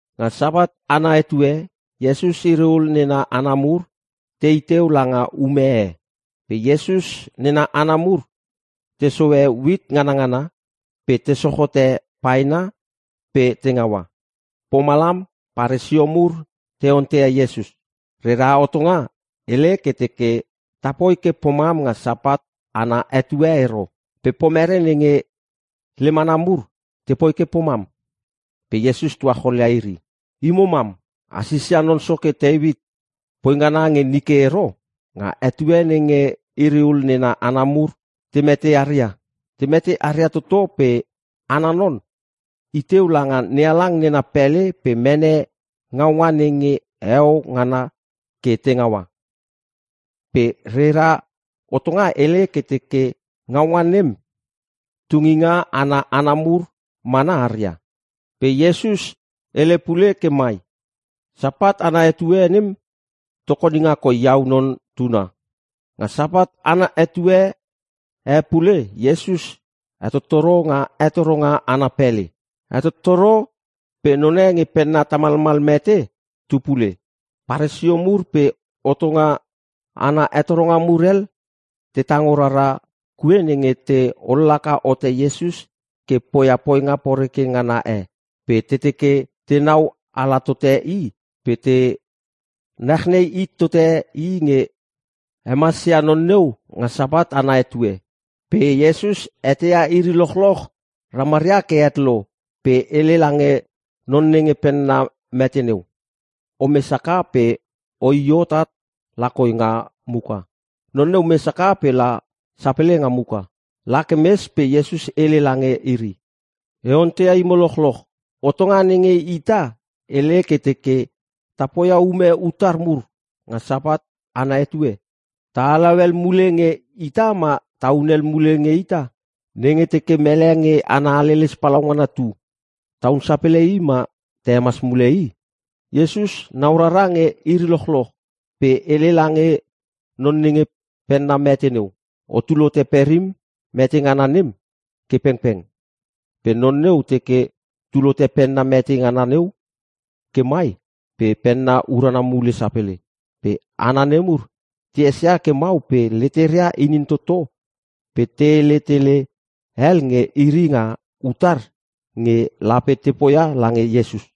Nga Sapat ana etue Iesus iri ul nena hana mur tei teu langa ume e. Pe Iesus nena hana mur te sohe uit nganangana pe te soch hote paena pe te ngaua. Pomalam Paresio mur te onteia Iesus, “Rera hotonga hele ke teke tapoi ke pomam nga Sapat ana etue ero. Pe pomere nenge lem hana mur tepoi ke pomam?” Pe Iesus tuacholia iri, “Imo mam a sisia non soke Teuit poi ngana nge nike ero? Nga etue nenge iri ul nena hana mur te mete aria? Te mete aria toto pe ana non i teu langa NeHalang nena pele pe mene ngaunga nenge heo ngana ke te ngaua. Pe rera hotonga hele ke teke ngaunga nem tunginga ana hana mur mana aria.” Pe Iesus hele pule ke mai, “Sapat ana etue nem tokoninga koi iau Non Tuna.” Nga Sapat ana etue e pule Iesus hetottoro nga hetoronga ana pele. Hetottoro pe none nge penna tamalmal mete tu pule. Paresio mur pe hotonga ana hetoronga mur hel te tango rara kue nenge te ollaka hote Iesus ke poia poinga poreke ngana e. Pe te teke tenau ala tote i pe te nachnei hit tote i nge hemas ia non neu nga Sapat ana etue. Pe Iesus eteia iri lochloch ramaria ke het lo pe hele lange non nenge penna mete neu, “Omes haka pe oi hot at lakoi nga muka.” Non neu mes haka pe la sapele nga muka. La ke mes pe Iesus hele lange iri, “E onteia imo lochloch. Hotonga nenge ita hele ke teke ta poia ume utar mur nga Sapat ana etue? Ta halau hel mule nge ita ma ta hunel mule nge ita? Nenge teke mele nge ana haleles palaungana tu tahun sapele i ma ta hemas mule i?” Iesus nau rara nge iri lochloch pe hele lange non nenge penna mete neu, “Otul hote perim mete ngana nem ke pengpeng.” Pe non neu teke tul hote penna mete ngana neu ke mai pe penna urana mule sapele. Pe hana nemur te esia ke mau pe leteria inin toto pe te hele tele hel nge iri nga utar nge lape te poia lange Iesus.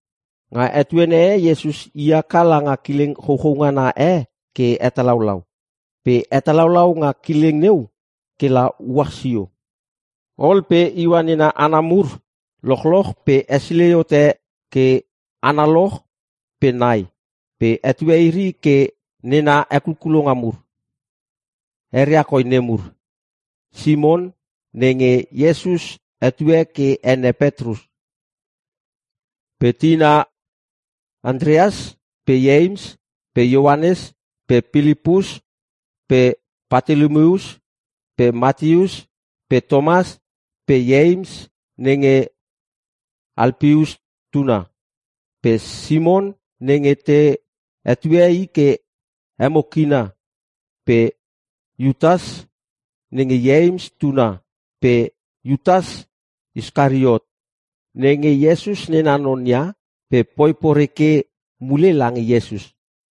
Nga etuene e Iesus i haka langa kileng chouchou ngana e ke hetalaulau. Pe hetalaulau nga kileng neu ke la uach sio. Ol pe iua nena hana mur lochloch pe hesilei hot ke analoch pe nai pe hetue iri ke nena hekulkulonga mur. Eria koi nemur: Simon (nenge Iesus hetue ke ene Petrus) pe tina Antreas pe Ieims pe Ioanes pe Pilipus pe Patolomius pe Mateus pe Tomas pe Ieims (nenge Alpeus tuna) pe Simon (nenge te hetue i ke Emo Kina) pe Iutas (nenge Ieims tuna) pe Iutas Iskariot (nenge Iesus nena non ia pe poi poreke mule lange Iesus).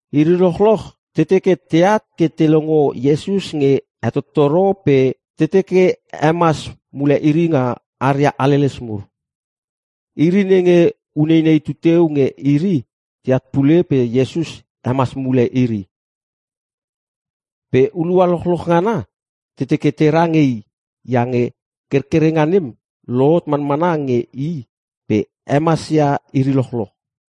Iri lochloch te teke teat ke te longo Iesus nge hetottoro pe te teke hemas mule iri nga aria haleles mur. Iri nenge uneinei tuteu nge iri teat pule pe Iesus hemas mule iri. Pe hulua lochloch ngana te teke tera nge i iange kerkerenga nem lohot manmana nge i pe hemasia iri lochloch.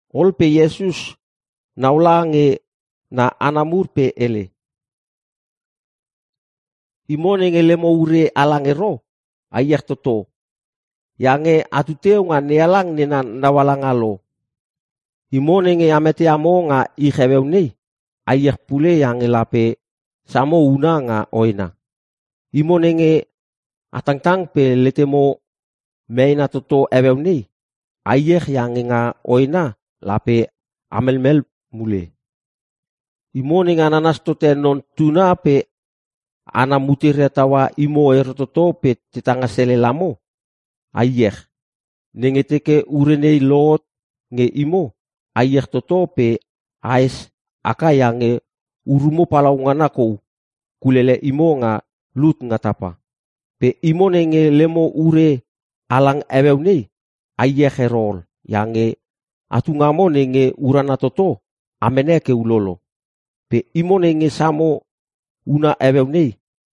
Ol pe Iesus naula nge na hana mur pe hele, “Imo nenge lemo ure halang ero, a iech toto iange atu teu nga NeHalang nena naualanga lo! Imo nenge a meteamo nga ich heueu nei, a iech pule iange lape samo una nga hoena. Imo nenge a tangtang pe letemo meena toto heueu nei, a iech iange nga hoena lape a melmel mule. “Imo nenge a nanas tote Non Tuna pe hana muteria taua imo ero toto pe te tanga selel amo, a iech! Nenge teke ure nei lohot nge imo, a iech toto pe ahes haka iange urumo palaungana kou kulele imo nga lut nga tapa. “Pe imo nenge lemo ure halang heueu nei, a iech ero ol iange atu ngamo nenge urana toto a mene ke ulolo! Pe imo nenge samo huna heueu nei,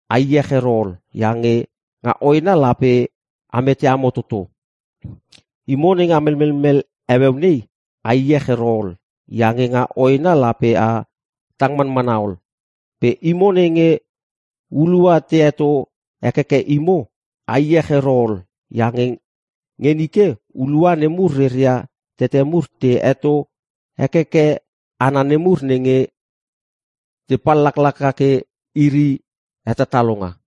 a iech ero ol iange nga hoena lape a meteamo toto! Imo nenge a melmelmel heueu nei, a iech ero ol iange nga hoena lape a tang manmana ol! Pe imo nenge hulua te heto hekeke imo, a iech ero ol iange nge nike hulua nemur reria tete mur te heto hekeke hana nemur nenge te pallaklaka ke iri hetatalonga.”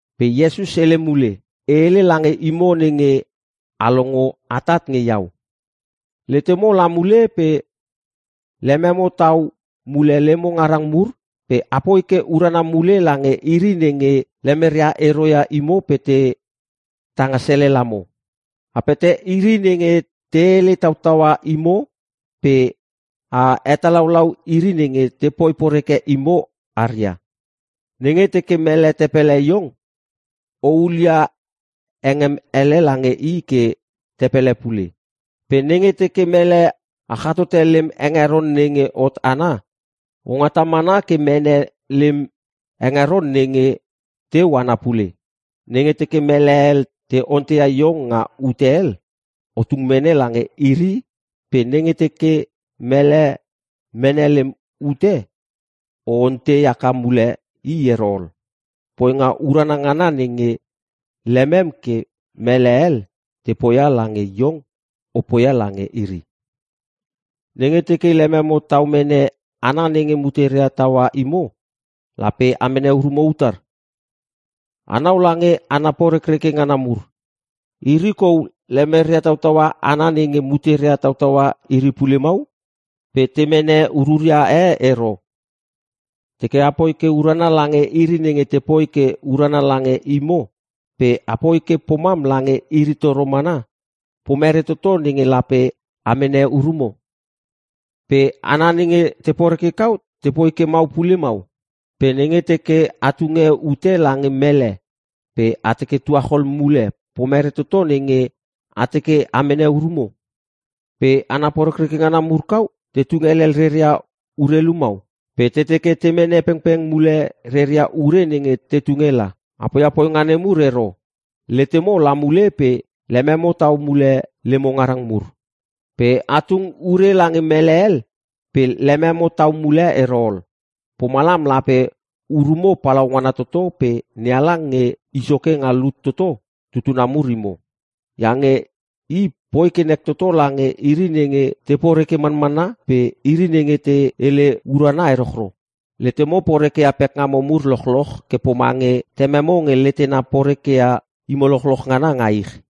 Pe Iesus hele mule, “E hele lange imo nenge a longo atat nge iau. Letemo la mule pe lememo tau mule lemo ngarang mur pe apoi ke urana mule lange iri nenge lemeria ero ia imo pe te tanga selel amo. A pete iri nenge te hele tautaua imo pe a hetalaulau iri nenge tepoi porekreke imo aria. Nenge teke mele te pele iong o hulia hengem ele lange i ke te pele pule. Pe nenge teke mele achatote lem hengeron nenge hot ana, o ngata mana ke mene lem hengeron nenge teu ana pule. Nenge teke mele hel te onteia iong nga ute hel, o tung mene lange iri pe nenge teke mele mene lem ute o ontei haka mule i ero ol. Poinga urana ngana nenge lemem ke mele hel te poia lange iong o poia lange iri. “Nenge teke lememo tau mene hana nenge muteria taua imo lape a mene urumo utar? Anau lange hana porekreke ngana mur. Iri kau lemeria tautaua hana nenge muteria tautaua iri pule mau pe te mene ururia e ero. Teke apoi ke urana lange iri nenge tepoi ke urana lange imo pe apoi ke pomam lange iri toro mana, pomere toto nenge lape a mene urumo? Pe hana nenge te poreke kau tepoi ke mau pule mau! Pe nenge teke a tunge ute lange mele pe a teke tuachol mule pomere toto nenge a teke a mene urumo? Pe hana porekreke ngana mur kau te tung helel reria urelu mau pe te teke te mene pengpeng mule reria ure nenge te tunge la! A poia poinga nemur ero! Letemo la mule pe lememo tau mule lemo ngarang mur. Pe a tung ure lange mele hel pe lememo tau mule ero ol. Pomalam lape urumo palaungana toto pe NeHalang Nge I Soke Nga Lut Toto tutuna mur imo. Iange I poi ke nek toto lange iri nenge te poreke manmana pe iri nenge te hele urana erochro. Letemo porekeia pekngamo mur lochloch ke pomange tememo nge letena porekeia imo lochloch ngana nga ich.”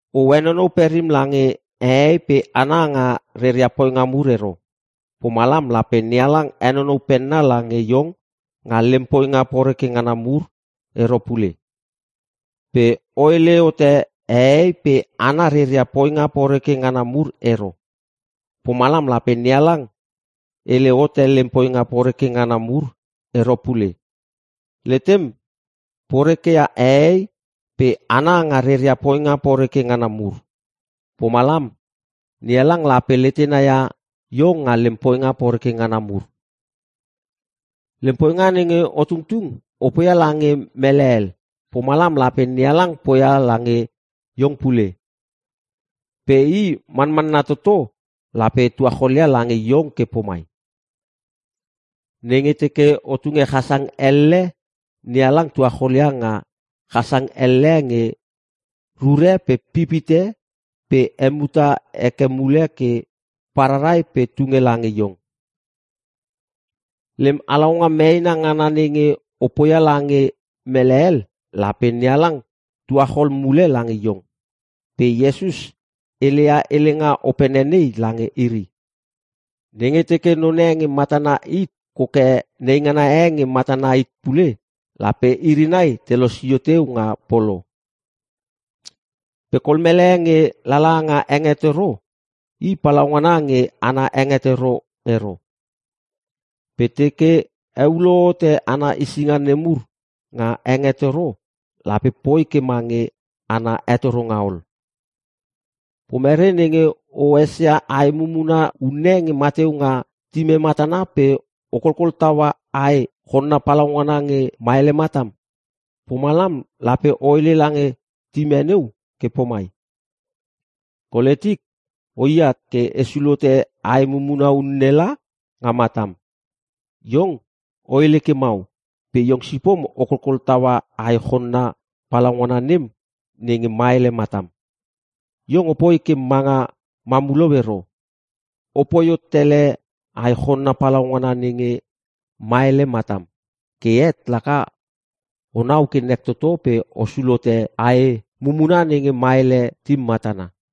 “O henonou perim lange hehei pe hana nga reria poinga mur ero. Pomalam lape NeHalang henonou penna lange iong nga lem poinga poreke ngana mur ero pule. Pe o hele hote hehei pe hana reria poinga poreke ngana mur ero. Pomalam lape NeHalang hele hote lem poinga poreke ngana mur ero pule. Letem poreke ia hehei pa hana nga reria poinga poreke ngana mur. Pomalam NeHalang lape letena ia iong nga lem poinga poreke ngana mur. Lem poinga nenge o tungtung o poia lange mele hel. Pomalam lape NeHalang poia lange iong pule. Pe i manmanna toto lape tuacholia lange iong ke pomai: nenge teke o tunge chasang elle NeHalang tuacholia nga chasang elle nge rure pe pip hite pe hemuta heke mule ke pararai pe tunge lange iong. Lem halaunga meena ngana nenge o poia lange mele hel lape NeHalang tuachol mule lange iong.” Pe Iesus heleia helenga opene nei lange iri, “Nenge teke none nge matana hit koke neingana e nge matana hit pule lape iri nai te losio teu nga polo. Pe kol mele nge lala nga hengetoro i palaungana nge ana hetoronga ero. Pe teke heulo hote ana hesinga nemur nga hengetoro lape poi ke mange ana hetoronga ol. “Pomere nenge o esia ae mumuna unne nge mateu nga tim e matana pe o kolkol taua ae chonna palaungana nge maele matam? Pomalam lape o hele lange tim e neu ke pomai, ‘Kole tik, o iat ke e sulhote ae mumuna unne langa matam.’ Iong o hele ke mau pe iong sipom o kolkol taua ae chonna palaungana nem nenge maele matam. Iong opoi ke manga mamulou ero! Opoi hot tele ae chonna palaungana nenge maele matam. Ke het laka onau ke nek toto pe o sulhote ae mumuna nenge maele tim matana.”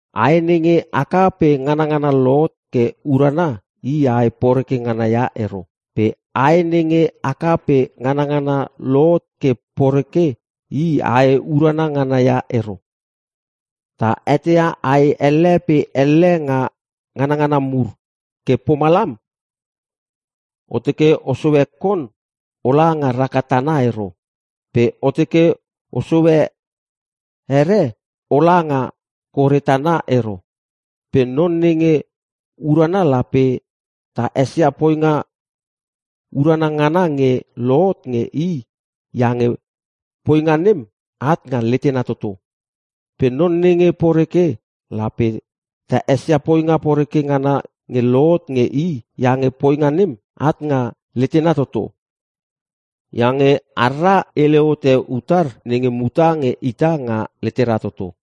“Ae nenge haka pe nganngana lohot ke urana i ae poreke ngana ia ero. Pe ae nenge haka pe nganangana lohot ke poreke i ae urana ngana ia ero. Ta eteia ae elle pe elle nga nganngana mur ke pomalam, o teke o sohe kon ola nga raka tana ero. Pe o teke o sohe here, ola nga kore tana ero. Pe non nenge urana lape ta esia poinga urana ngana nge lohot nge i iange poinga nem at nga letena toto. Pe non nenge poreke lape ta esia poinga poreke ngana nge lohot nge i iange poinga nem at nga letena toto. Iange harra hele hote utar nenge muta nge ita nga letera toto.”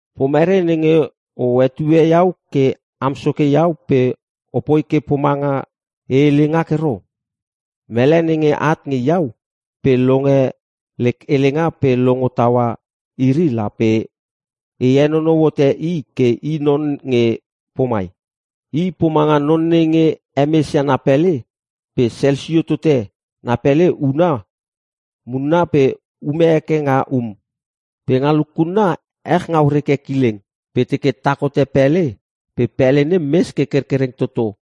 “Pomere nenge o hetue iau ke am Soke iau pe opoi ke pomanga e hele ngak ero? Mele nenge at nge iau pe longe lek helenga pe longo taua iri lape e henonou hote i ke i non nge pomai: I pomanga non nenge hemesia na pele pe selsio tote na pele huna munna pe ume heke nga um. Pe nga lukunna ech ngau reke kileng pe teke tak hote pele pe pele nem mes ke kerkereng toto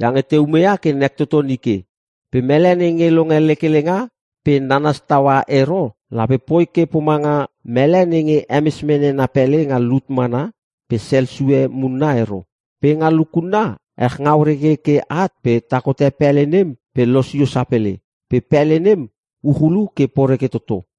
iange te umeia ke nek toto nike. Pe mele nenge longe lek helenga pe nanas taua ero lape poi ke pomanga mele nenge hemes mene na pele nga lut mana pe sel sue munna ero. Pe nga lukunna ech ngau reke ke at pe tak hote pele nem pe losio sapele. Pe pele nem uchulu ke poreke toto.”